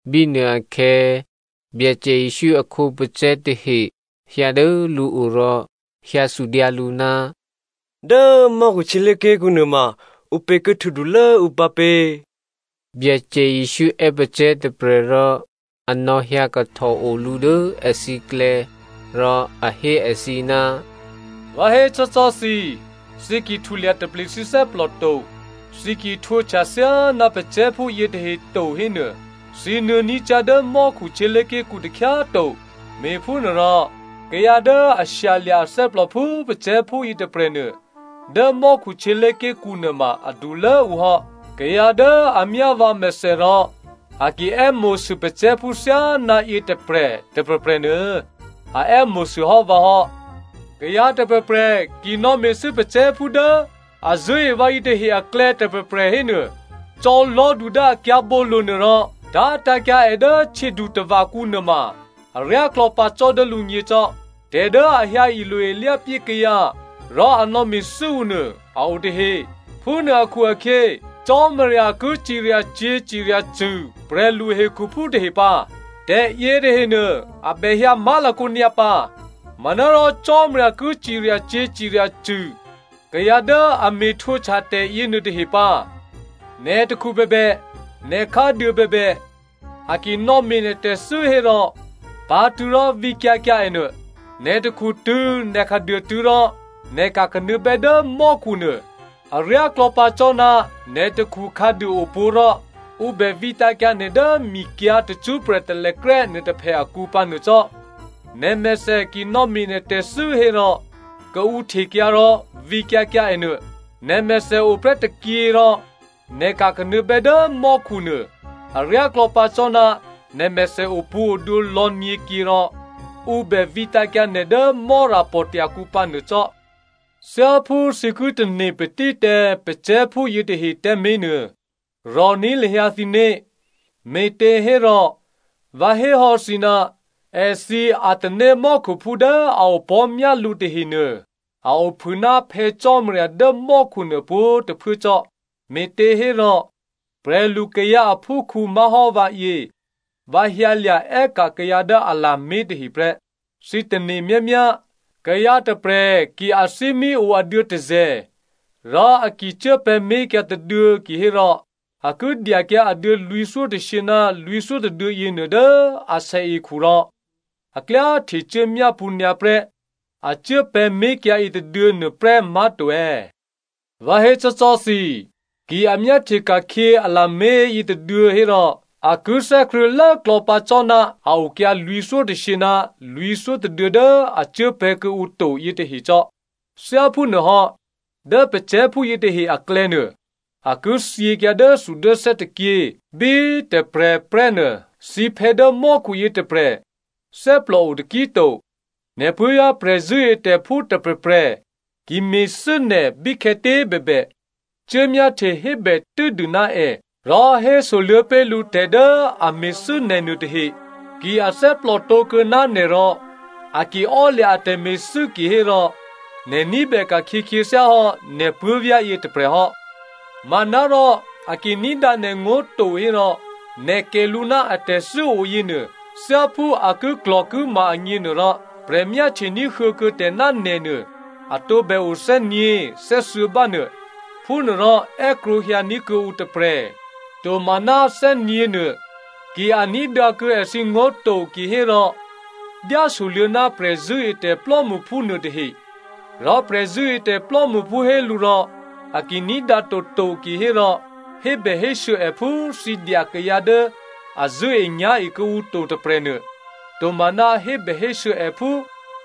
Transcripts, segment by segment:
Bínuôakhè̌, Byacè Jesǔ a khǒpacè̤̌ tahe hyǎ dố lǔo rò hyǎ sudyǎ lǔ, “Dố mò́khu htyělé̤ké̤kǔ nuôma, ǔpě ki htwǒdulố ǔ pǎpě?” Byacè Jesǔ è́ pacè̤̌ tôprè̤ rò a nò̌hyǎ kahtòo lǔ dố èthǐklè̌. Rò a hé èthǐ, “Vǎ hécò́cò́ thǐ꤮, thǐ ki htulya taple thǐ thè́plò to, thǐ ki htwǒhtya thyáná pacè̤̌phú yětahe to hénuô, thǐ nuô̌ní̤ cyá̤ dố mò́khu htyělé̤ké̤kǔ takhyá꤮ to. Me̤phúnuôrò, kayǎ dố a shyalya̤ athè́plò phú pacè̤̌phú yětôprè̤nuô, dố mò́khu htyělé̤ké̤kǔ nuôma adulốǔ hò́. “Kayǎ dố a myá vǎmèthè rò a ki è́mo̤sû pacè̤̌phú thyáná yětôprè̤ tôprè̤prè̤nuô a è́mo̤sû hò́ vǎ hò́.” “Kayǎ tôprè̤prè̤ ki nò̌me̤thû́ kayǎ patílố dố a zṳ̂́e vǎ yětahe aklè̌ tôprè̤prè̤ hénuô, cò̌ lò̤́du dố a kyǎ̤bǒlo̤nuô rò tá̤tǎ̤kyǎ è dố htyědutava̤kǔ nuôma aryáklò̌ pǎ cò́ dố lǔgně cò́. “Tè̤ dố a hyǎ ilo-ilyápyé kayǎ rò a nò̌me̤thû́ ǔ nuô a o tahe. Phúnuô akhu-akhyě Cò́marya ki ciryacyě̤ ciryacṳ̂ prè̤lu hekhuphú tahe pǎ. Tè̤ yětahenuô, a bè hyǎ má̤lakǒ nyǎpǎ. Manárò Cò́marya ki ciryacyě̤ ciryacṳ̂ kayǎ dố a me̤ htwǒhtya tè̤ yěnuôtahe pǎ. Nè̤ takhu bèbè, nè̤ khǎduô bèbè, a ki nò̌me̤ nè̤ tè̤thû́ hérò pǎ̤tṳ̂̌ rò vǐkyǎ kyǎ ènuô. Nè̤ takhutṳ̂̌ nè̤ khǎduôtṳ̂̌ rò nè̤ ka̤kanuô̌bè́ dố mò́khunuô aryáklò̌ pǎ cò́ ná nè̤ takhu khǎduô ǒpwǒ̤ rò ǔ bè vǐtǎ̤kyǎ nè̤ dố mikyǎ̤ tacṳ́prè̤ talèkrè́ nuôtôphè akǔ pǎnuô cò́. Nè̤mèthè ki nò̌me̤ nè̤ tè̤thû́ hérò kaǔhtekyǎ rò vǐkyǎ kyǎ ènuô. Nè̤mèthè oprè́ tôkyě rò nè̤ ka̤kanuô̌bè́ dố mò́khu nuô aryáklò̌ pǎ cò́ ná nè̤mèthè opwǒ̤odwǒ lò̌nyě̤kyě rò ǔ bè vǐtǎ̤kyǎ nè̤ dố Mò́rapò̤tya̤ kǔ pǎnuô cò́.” “Thyáphú thǐ ki tane̤ patí tǎ kayǎ patílố dố ǔklè̌ yětahe tǎmé̤ nuô, rò̤ní̤ lahyǎ thǐné̤. Me̤těhérò vǎ hé hò́ thǐ, èthǐ atanémò́khuphú dố a opò̤́ myá lǔ tahenuô a ophû ná Phè̌ Cò́marya dố mò́khu nuô pwǒ̤꤮ tôphuố cò́. Me̤těhérò, prè̤lukayǎ aphúkhǔ má̤hò́ vǎyě, vǎ hyǎlya̤ è́ka̤ kayǎ dố a lamé̤ tahe prè́. “Thǐ tane̤ myámyá, kayǎ tôprè̤ ki athímí o aduô̌ tôzè̤, rò a ki cuốpè̤̌ mé̤kyǎ tôduô̌ kihérò a ki dyakyǎ aduô̌ lwǐ̤thyótôshyě ná lwǐ̤thyó tôduô̌ yěnuô dố asèekhu rò a klyá htecuố myápṳ̌ nyǎprè́ a cuốpè̤̌ mé̤kyǎ yětôduô̌ nuôprè́ má̤to è̌? Vǎ hécò́cò́ thǐ, ki a myáhtye ka̤khyě a lamé̤ yětôduô̌ hérò, a ki thè́krṳ̂̌ lốklò̌ pǎ cò́ ná a okyǎ lwǐ̤thyótôshyě ná lwǐ̤thyó tôduô̌ dố a cuốpè̤̌ kuô̌ǔ to yětahe cò́. Thyáphúnuôhò́, dố kayǎ patílố dố ǔklè̌ yětahenuô, a ki thyěkyǎ dốthudốthè́ tôkyě bí tôprè̤ prè́ nuô, thǐphè̌ dố mò́khuyě tôprè̤ thè́plòo taki꤮ to.” “Nè̤ puố̤vyá̤ prè̤zṳ̂́etè̤phú tôprè̤prè̤ ki me̤thû́ nè̤ bíkhè̌tě꤮ bèbè, cuốmyáhtye hébè tû́dû ná è rò hésoluô̌ pé̤ lǔ tè̤ dố a me̤thû́ nè̤ nuô tahe. Ki a thè́plòtǒ kuô̌ ná nè̤ rò a ki ò́lya̤ a tè̤me̤thû́ kihérò nè̤ ní̤bè ka̤khyě khyěthyá hò́ nè̤ puố̤vyá̤yě tôprè̤ hò́. Manárò a ki ní̤dǎ nè̤ngó̤ to hérò, nè̤ kè̤ lǔ ná atè̤thû́ o yěnuô, thyáphú a kiklò̤kima agněnuôrò, prè̤ myáhtye ní̤huô̌ kuô̌ tè̤ ná nè̤nuô, a tǒbè o thè́nyě̤, thè́thuô̌ bá nuô. Phúnuôrò è́krwǒhyǎní̤ kuô̌ǔ tôprè̤, tomaná thè́nyě̤ nuô. Ki a ní̤dǎkuô̌ èthǐngó̤ to kihérò dyásoluô̌ ná prè̤zṳ̂́etè̤ plò́mṳphú nuô tahe, rò prè̤zṳ̂́etè̤ plò́mṳphú hé lǔ rò a ki ní̤dǎ toto kihérò hébèhésû̌ è phú thǐ dya kayǎ dố a zṳ̂́enyá̤e kuô̌ǔ to tôprè̤nuô, tomaná hébèhésû̌ è phú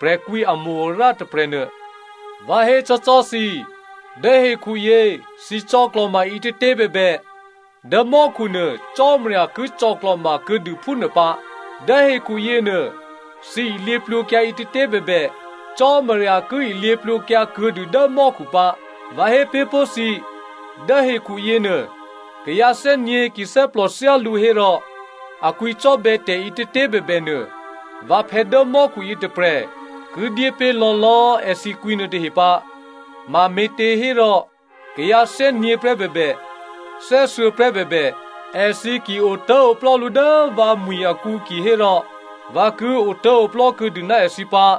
prè̤kwǐamo-arǎ tôprè̤nuô. “Vǎ hécò́cò́ thǐ, dố hekhuyě thǐ cò̌klò̤ma ǐtětě꤮ bèbè, dố mò́khu nuô, Cò́marya ki cò̌klò̤ma kuô̌dû phúnuô pǎ. Dố hekhu yěnuô thǐ ilyěplwǒkyǎ ǐtětě꤮ bèbè, Cò́marya ki ilyěplwǒkyǎ kuô̌dû dố mò́khu pǎ. “Vǎ hé pé̤ pó̤ thǐ, dố hekhu yěnuô, kayǎ thè́nyě̤ ki thè́plò thyálǔ hérò a kwǐcò́bè̌ tè̤ǐtětě꤮ bèbènuô vǎphè̌ dố mò́khu yětôprè̤ ki dyépé̤ lò̌lò̌꤮ èthǐ kwǐnuô tahe pǎ. Mame̤těhérò, kayǎ thè́nyě̤prè́ bèbè, thè́thuô̌prè́ bèbè, èthǐ ki otố̤oplò́ lǔ dố vǎmwi̤ akǔ kihérò vǎ ki otố̤oplò́ kuô̌dû ná èthǐ pǎ.”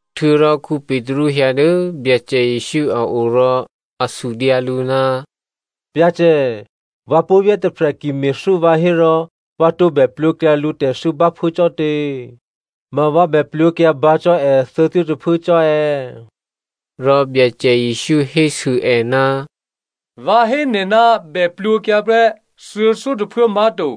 Htuô̌rò Petru hyǎ dố Byacè Jesǔ a o rò a sudyǎ lǔ, “Byacè, vǎ puố̤vyá̤ tôprè̤ ki me̤thû́ vǎ hérò vǎ tǒbè plwǒkyǎ lǔtè̤thû́ báphuố cò́tě? Ma vǎ bè plwǒkyǎ bǎ cò́ è thuô̌thyótôphuố cò́ è̌?” Rò Byacè Jesǔ hésû è, “Vǎ hé nè̤ ná bè plwǒkyǎ prè́ thuô̌thyótôphuố má̤to,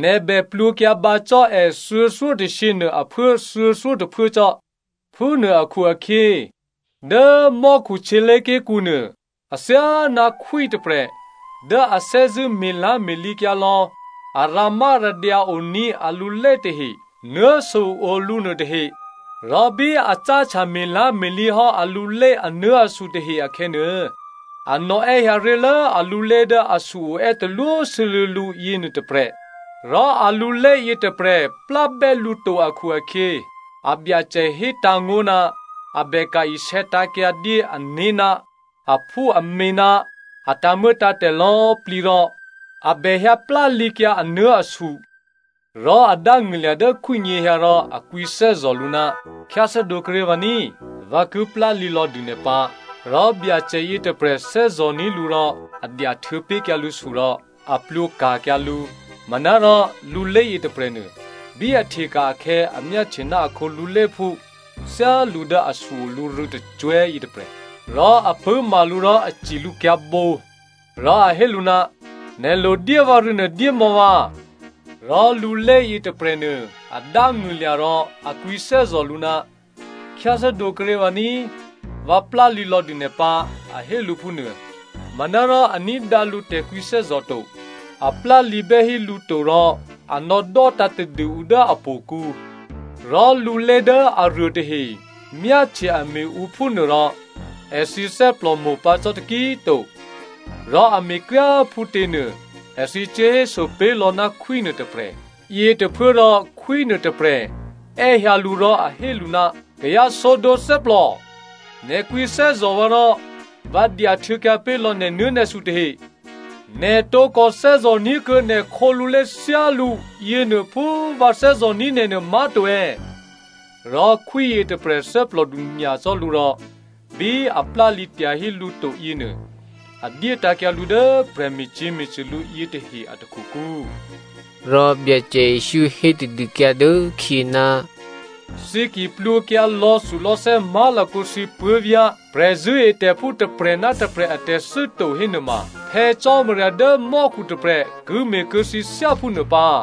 nè̤ bè plwǒkyǎ bǎ cò́ è thuô̌thyótôshyě nuô aphuố thuô̌thyótôphuố cò́. “Phúnuô akhu-akhyě, dố mò́khu htyělé̤ké̤kǔ nuô athyáná khwí tôprè̤ dố a thè́zṳ̂́ me̤lá̤me̤lǐkyǎ lò̌ a rǎmárǎdyǎ oní̤ alulé tahe nuố̤su o lǔ nuôtahe. Rò bí a cáhtya me̤lá̤me̤lǐ hò́ alulé anuố̤asu tahe akhè̌nuô, a nò̌è́hyǎ ré̤lố alulé dố asu-o è́talwósû́lû̌ lǔ yěnuô tôprè̤. Rò alulé yětôprè̤ plábè́ lǔ to akhu-akhyě, abyacè hétǎ̤ngó̤ ná a bèka̤ isè̌tǎ̤kyǎ dyé ané̤ ná aphúamě ná a tǎ̤muô̌tǎ̤tè̤ lò̌꤮ plǐ rò a bè hyǎ plálǐkyǎ anuố̤asu. “Rò a dángṳ̂lya̤ dố khwí nyěhyǎ rò a kwǐthè́zò̤ lǔ, ‘Khyáthè́dǒ kuốré̤ vǎ ní꤮. Vǎ ki plálǐ lò̌dû nè̤ pǎ.’ Rò Byacè yětôprè̤ thè́zò̤ní̤ lǔ rò a dyahtuô̌ pé̤kyǎ lǔsu rò a plwǒka̤kyǎ lǔ. “Manárò, lulé yětôprè̤nuô, bí a hteka̤ akhè̌ a myáhtye ná akhǒ luléphú thyálǔ dố asu-o lǔ rû̌tôcwè̤́ yětôprè̤. Rò a pṳ̂́ma lǔ rò a ci lǔ kyǎ̤bǒ rò a hé lǔ, ‘Nè̤ lodyé vǎrû̌nuô dyémò̌ vǎ.’ “Rò lulé yětôprè̤nuô a dángṳ̂lya̤ rò a kwǐthè́zò̤ lǔ, ‘Khyáthè́dǒ kuốré̤ vǎ ní꤮, vǎ plálǐ lò̌dû nè̤ pǎ,’ a hé lǔ phúnuô. “Manárò a ní̤dǎ lǔ tè̤kwǐthè́zò̤ to. A plálǐbè́ hí lǔ to rò a nò̌dò́tǎ̤ tadû ǔ dố htò̌kǔ. Rò lulé dố aruô tahe myáhtye a me̤ ǔ phúnuôrò èthǐ thè́plòmo̤pǎ cò́ taki꤮ to. Rò a me̤kryá꤮ phútěnuô èthǐ cuốhéso pé̤lò̌ ná khwí nuôtôprè̤. “Yětôphuốrò khwí nuôtôprè̤ è́hyǎ lǔ rò a hé lǔ, ‘Kayǎ sǒdǒ thè́plò, nè̤ kwǐthè́zò̤ vǎ rò vǎ dyahtuô̌kyǎ pé̤lò̌ nè̤nuố̤nè̤su tahe, nè̤ tǒkò thè́zò̤ ní̤kuô̌ nè̤ khǒlulé thyálǔ yěnuô phú vǎ thè́zò̤ní̤ nè̤ nuô, má̤to è̌?’ Rò khwí yětôprè̤ thè́plòdu nyacò́ lǔ rò bí a plálǐ tyahí lǔ to yěnuô a dyétǎ̤kyǎ lǔ dố prè̤me̤cyě̤me̤cṳ̂ lǔ yětahe a takhukǔ.” Rò Byacè Jesǔ hé tadûkyǎ dốkhyě, “Thǐ ki plwǒkyǎ lò̌thulò̌thè́ má̤lakǒ thǐ puố̤vyá̤ prè̤zṳ̂́etè̤phú tôprè̤ ná tôprè̤ atè̤thû́ to hénuôma, Phè̌ Cò́marya dố mò́khu tôprè̤ ki me̤ kuô̌ thǐ thyáphúnuô pǎ.”